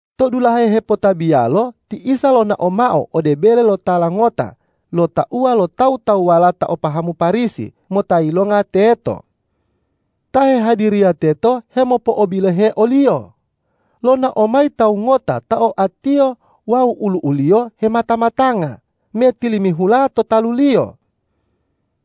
To dulahe hepotabiyalo ti Isa lonao mao ode bele lo tala ngota lo tauwa lo tawu-tawuwala ta o pahamu Parisi mota yilonga teto. Ta hehadiriya teto hemopo'obilohe o-Liyo. Lonao mayi tawu ngota ta oatiyo wawu olu'u-Liyo hemata-matanga me tilimihula to talu-Liyo.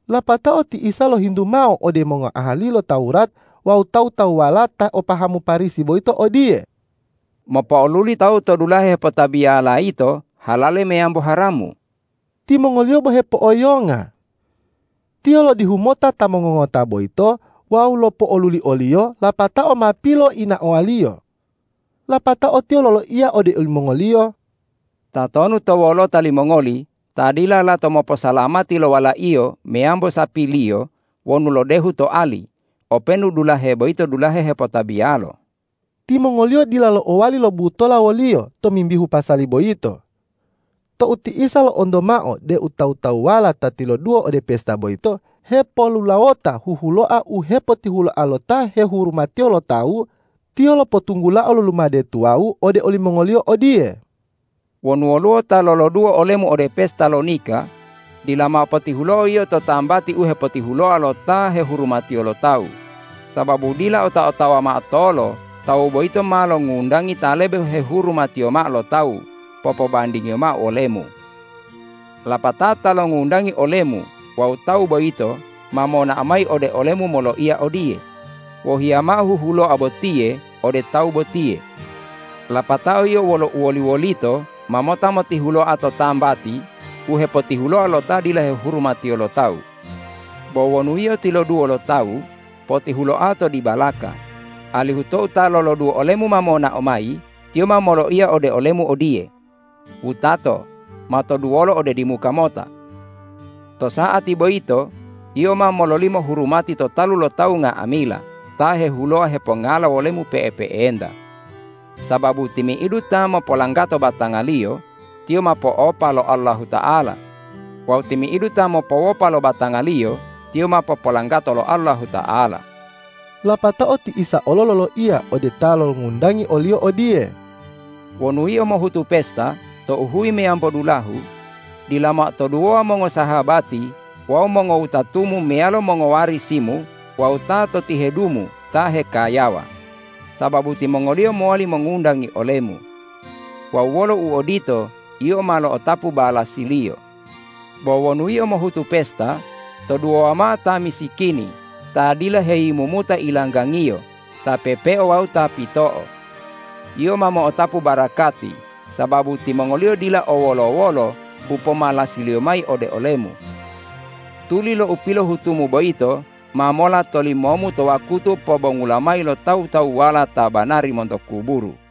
Lapatao ti Isa lohintu mao ode mongoahali lo Tawurat wawu tawu-tawuwala ta o pahamu Parisi boyito odiye,”Mopo'oluli tawu to dulahe hepotabiyala yito halale meyambo haramu?” Timongoliyo bo hepo'oyonga. Tiyo lodihu mota ta mongongota boyito wawu lopo'oluli oliyo lapatao ma piloinaowa-Liyo. Lapatao Tiyo loloiya ode olimongoliyo,”Tatonu to wolota limongoli ta dila lato moposalamati lo walaiyo meyambo sapiliyo wonu lodehu to ali, openu dulahe boyito dulahe hepotabiyalo?” Timongoliyo dila lo'owali lobutola wo-Liyo tomimbihu pasali boyito. Tou ti Isa lo'onto mao deu tawu-tawuwala ta tiloduwo ode pesta boyito hepolulawota huhuloa u hepotihuloa lo ta hehurumatiyo lo tawu, Tiyo lopotunggulao lo lumade tuwawu ode olimongoliyo odiye, ”Wonu woluwo ta loloduwo olemu ode pesta lo nika, dila mao potihulo'o yio to tambati u hepotihuloa lo ta hehurumatiyo lo tawu, sababu dila ota-otawa mao tolo tawu boyito ma longundangi ta lebe hehurumatiyo mao lo tawu popobandingiyo mao wolemu. Lapatao ta longundangi olemu wawu tawu boyito ma monao mayi ode olemu moloiya odiye, ’Wohiya mao huhuloa botiye ode tawu botiye.’ Lapatao yio wolo uwoli-wolito ma mota motihuloa to tambati u hepotihuloa lo ta dila hehurumatiyo lo tawu. Bo wonu yio tiloduwo lo tawu, potihuloao to dibalaka, alihu tou ta loloduwo olemu ma monao mayi, tiyo ma moloiya ode olemu odiye, ’Wutato, matoduwolo ode dimuka mota.’ To sa'ati boyito yio ma mololimo hurumati to talu lo tawu nga'amila ta hehuloa hepongala wolemu pe'epe'enta. Sababu timi'idu ta mopolanggato batangaliyo, tiyo ma po'opa lo Allahuta'ala; wawu timi'idu ta mopowopa lo batangaliyo, tiyo ma popolanggato lo Allahuta'ala.” Lapatao ti Isa olo loloiya ode ta longundangi o-Liyo odiye,”Wonu yio mohutu pesta tou huyi meyambo dulahu, dila mao toduwowa mongosahabati wawu mongowutatumu meyalo mongowarisimu wawu ta to tihedumu ta hekayawa, sababu timongoliyo mowali mongundangi olemu. Wawu wolo uodito, yio ma lo'otapu balasiliyo. Bo wonu yio mohutu pesta, toduwowa mao ta misikini, ta dila heyimumuta ilanggangiyo, ta pepeo wawu ta pito'o. Yio ma mo'otapu barakati, sababu timongoliyo dila o wolo-wolo u pomalasiliyo mayi ode olemu. Tuli lo u pilohutumu boyito ma mola tolimomu to wakutu pobongula mayi lo tawu-tawuwala ta banari monto kuburu.”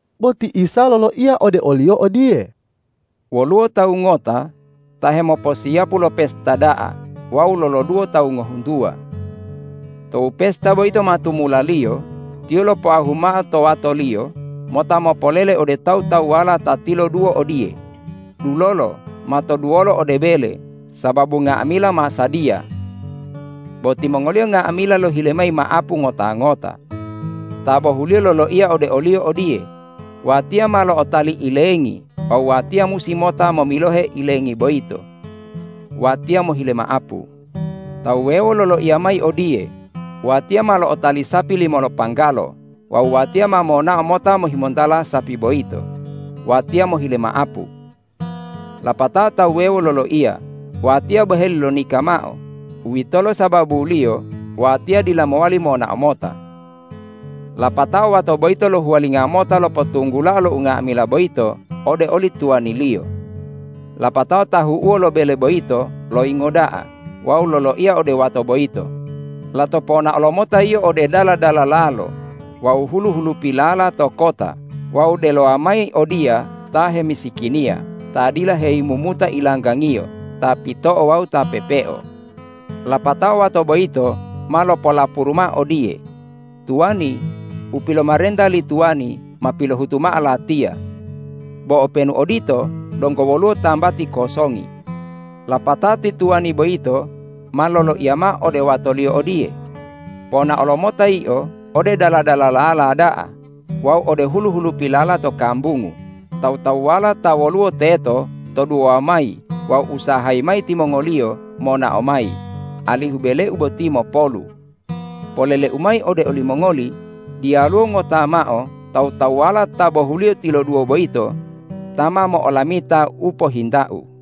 Bo ti Isa loloiya ode oliyo odiye,”Woluwo tawu ngota ta hemoposiyapu lo pesta da'a wawu loloduwo tawu ngohuntuwa. Tou pesta boyito ma tumulaliyo, tiyo lopoahu mao to watoliyo mota mopolele ode tawu-tawuwala ta tiloduwo odiye, ’Dulolo, matoduwolo ode bele sababu nga'amila ma sadiya!’ Bo timongoliyo nga'amila lohile mayi ma'apu ngota-ngota. Ta bohuliyo loloiya ode oliyo odiye, ’Watiya ma lo'otali ilengi wawu watiya musi mota momilohe ilengi boyito. Watiya mohile ma'apu.’ Ta wuwewo loloiya mayi odiye, ’Watiya ma lo'otali sapi limo lopanggalo wawu watiya ma monao mota mohimontala sapi boyito. Watiya mohile ma'apu.’ Lapatao ta wuwewo loloiya, ’Watiya boheli lonika mao; uwitolo sababuliyo watiya dila mowali monao mota.’ Lapatao wato boyito lohuwalingo mota lopotunggulao lo unga'amila boyito ode oli tuwaniliyo. Lapatao tahu'uwo lo bele boyito loyingo da'a wawu loloiya ode wato boyito, ’Lato ponaolo mota yio ode dala-dalalalo wawu hulu-hulupilala to kota wawu delowa mayi odiya ta hemisikiniya, ta dila heyimumuta ilanggangiyo, ta pito'o wawu ta pepeo.’ Lapatao wato boyito ma lopolapuru mao odiye, ’Tuwani, u pilomarenta li tuwani ma pilohutu mao latiya. Bo openu odito, donggo woluwo tambati kosongi.’ Lapatao ti tuwani boyito ma loloiya mao ode watoliyo odiye, ’Ponaolo mota yio ode dala-dalalala da'a wawu ode hulu-hulupilala to kambungu, tawu-tawuwala ta woluwo teto toduwowa mayi wawu usahayi mayi timongoliyo monao mayi alihu beleu boti mopolu. Poleleu mayi ode olimongoli: Diyaluwo ngota mao tawu-tawuwala ta bohuliyo tiloduwo boyito ta ma mo'olamita u pohintau.’”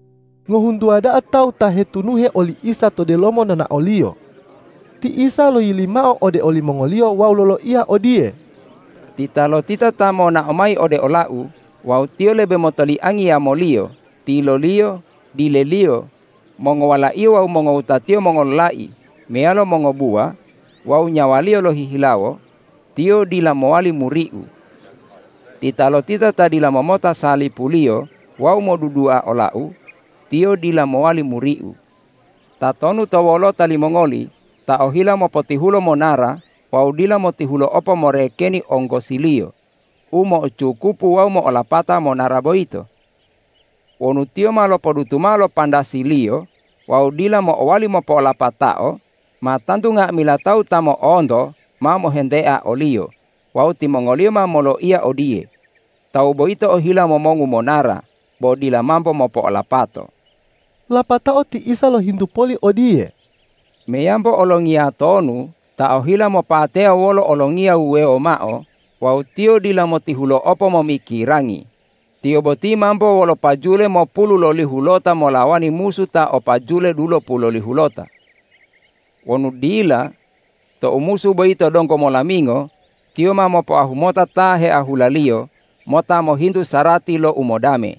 Ngohuntuwa da'a tawu ta hetunuhe oli Isa to delomo nonao-Liyo. Ti Isa loyili mao ode olimongoliyo wawu loloiya odiye, ”Titalotita ta monao mayi ode ola-U wawu tiyo lebe motoliangi yamoliyo, tiloliyo, dileliyo, mongowalaiyo wawu mongowutatiyo mongololai meyalo mongobuwa wawu nyawaliyo lohihilawo, tiyo dila mowali muri-U. Titalotita ta dila momota salipu-Liyo wawu modudua ola-U, tiyo dila mowali muri-U. Tatonu to wolota limongoli ta ohila mopotihulo monara wawu dila motihulo'opo morekeni onggosiliyo, u mo'ocukupu wawu mo'olapata monara boyito? Wonu tiyo ma lopodutu mao lo pandasiliyo wawu dila mo'owali mopolapatao, ma tantu nga'amila tawu ta mo'onto ma mohentea oliyo wawu timongoliyo ma moloiya odiye, ’Tawu boyito ohila momongu monara, bo dila mambo mopo'olapato!’” Lapatao ti Isa lohintu poli odiye,”Meyambo olongiya tonu ta ohila mopateya wolo olongiya wuwewo mao wawu tiyo dila motihulo'opo momikirangi, tiyo boti mambo wolo pajule mopululolihulota molawani musu ta o pajule dulopulolihulota? Wonu dila, tou musu boyito donggo molamingo, tiyo ma mopoahu mota ta heahulaliyo mota mohintu sarati lo umodame.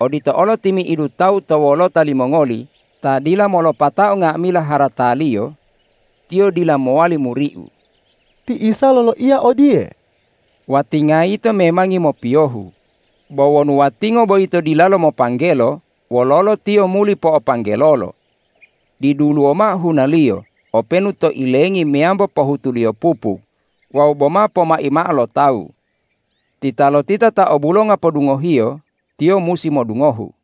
Odito olo timi'idu tawu to wolota limongoli ta dila molopatao nga'amila harataliyo, tiyo dila mowali muri-U.” Ti Isa loloiya odiye,”Watinga yito memangi mopiyohu. Bo wonu watingo boyito dilalo mopanggelo, wololo tiyo muli po'opanggelolo? Diduluwo mao hunaliyo openu to ilengi meyambo pohutuliyo pupuk wawu boma pomai mao lo tawu. Titalotita ta o bulonga podungohiyo, tiyo musi modungohu!”